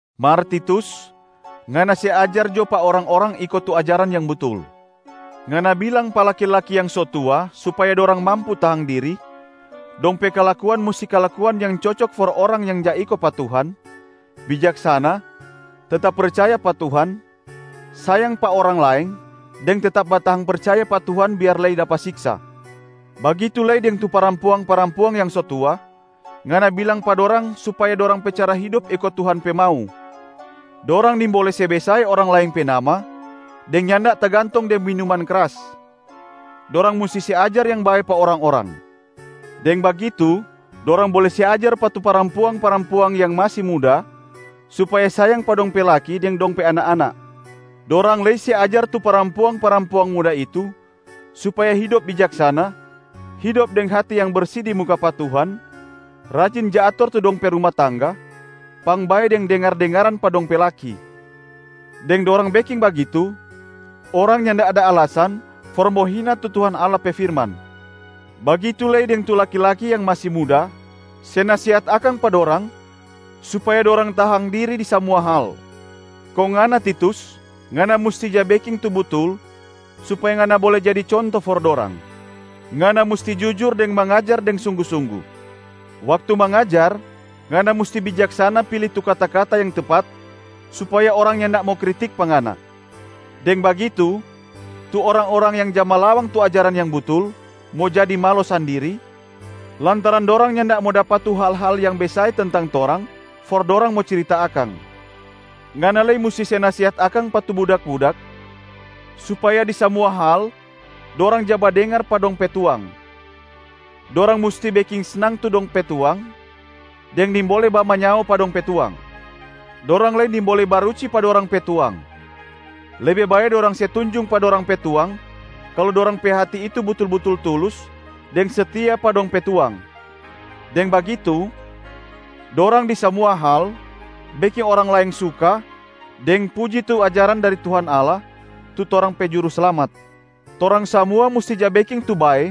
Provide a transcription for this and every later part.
Mar Titus, ngana se ajar jo pa orang-orang iko tu ajaran yang butul. Ngana bilang pa laki-laki yang so tua supaya dorang mampu tahang diri, dong pe kalakuan musti kalakuan yang cocok for orang yang ja iko pa Tuhan, bijaksana, tetap percaya pa Tuhan, sayang pa orang laeng deng tetap batahang percaya pa Tuhan biar lei dapa siksa. Bagitu lei deng tu parampuang-parampuang yang so tua, ngana bilang pa dorang supaya dorang pe cara hidop iko Tuhan pe mau. Dorang nimbole se besae orang laeng pe nama deng nyanda tagantong deng minuman kras. Dorang musti se ajar yang bae pa orang-orang. Deng bagitu dorang bole se ajar pa tu parampuang-parampuang yang masi muda supaya sayang pa dong pe laki deng dong pe anak-anak. Dorang lei se ajar tu parampuang-parampuang muda itu supaya hidop bijaksana, hidop deng hati yang bersi di muka pa Tuhan, rajin ja ator tu dong pe ruma tangga, pangbae deng dengar-dengaran pa dong pe laki. Deng dorang beking bagitu, orang nyanda ada alasan for mo hina tu Tuhan Allah pe firman. Bagitu lei deng tu laki-laki yang masi muda, se nasehat akang pa dorang supaya dorang tahang diri di samua hal. Kong ngana Titus, ngana musti ja beking tu butul supaya ngana bole jadi conto for dorang. Ngana musti jujur deng mangajar deng sunggu-sunggu. Waktu mangajar, ngana musti bijaksana pili tu kata-kata yang tepat supaya orang nyanda mo kritik pa ngana. Deng bagitu tu orang-orang yang ja malawang tu ajaran yang butul mo jadi malo sandiri, lantaran dorang nyanda mo dapa tu hal-hal yang besae tentang torang for dorang mo cirita akang. Ngana lei musti se nasehat akang pa tu budak-budak supaya di samua hal dorang ja badengar pa dong pe tuang. Dorang musti beking snang tu dong pe tuang deng nimbole bamanyao pa dong pe tuang. Dorang lei nimbole baruci pa dorang pe tuang. Lebe bae dorang se tunjung pa dorang pe tuang kalu dorang pe hati itu butul-butul tulus deng setia pa dong pe tuang. Deng bagitu, dorang di samua hal beking orang laeng suka deng puji tu ajaran dari Tuhan Allah, tu torang pe Juruslamat. Torang samua musti ja beking tu bae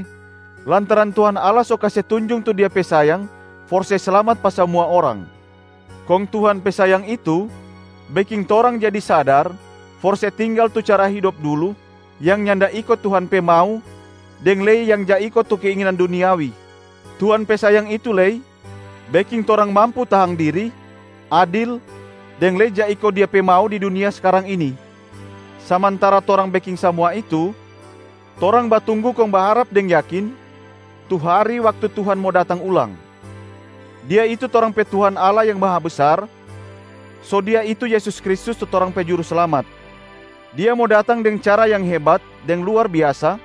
lantaran Tuhan Allah so kase tunjung tu Dia pe sayang for se slamat pa samua orang. Kong Tuhan pe sayang itu beking torang jadi sadar for se tinggal tu cara hidop dulu yang nyanda iko Tuhan pe mau deng lei yang ja iko tu keinginan duniawi. Tuhan pe sayang itu lei beking torang mampu tahang diri, adil deng lei ja iko Dia pe mau di dunia skarang ini. Samantara torang beking samua itu, torang batunggu kong baharap deng yakin tu hari waktu Tuhan mo datang ulang. Dia itu torang pe Tuhan Allah yang Mahabesar, so Dia itu Yesus Kristus tu torang pe Juruslamat. Dia mo datang deng cara yang hebat deng luar biasa,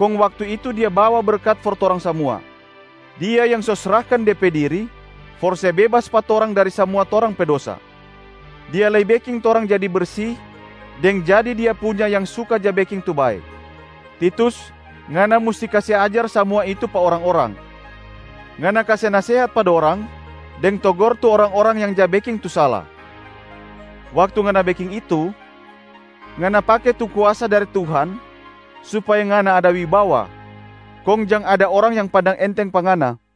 kong waktu itu Dia bawa berkat for torang samua. Dia yang so srahkan De pe diri for se bebas pa torang dari samua torang pe dosa. Dia lei beking torang jadi bersi deng jadi Dia punya yang suka ja beking tu bae. Titus, ngana musti kase ajar samua itu pa orang-orang. Ngana kase nasehat pa dorang, deng togor tu orang-orang yang ja beking tu sala. Waktu ngana beking itu, ngana pake tu kuasa dari Tuhan supaya ngana ada wibawa, kong jang ada orang yang pandang enteng pa ngana.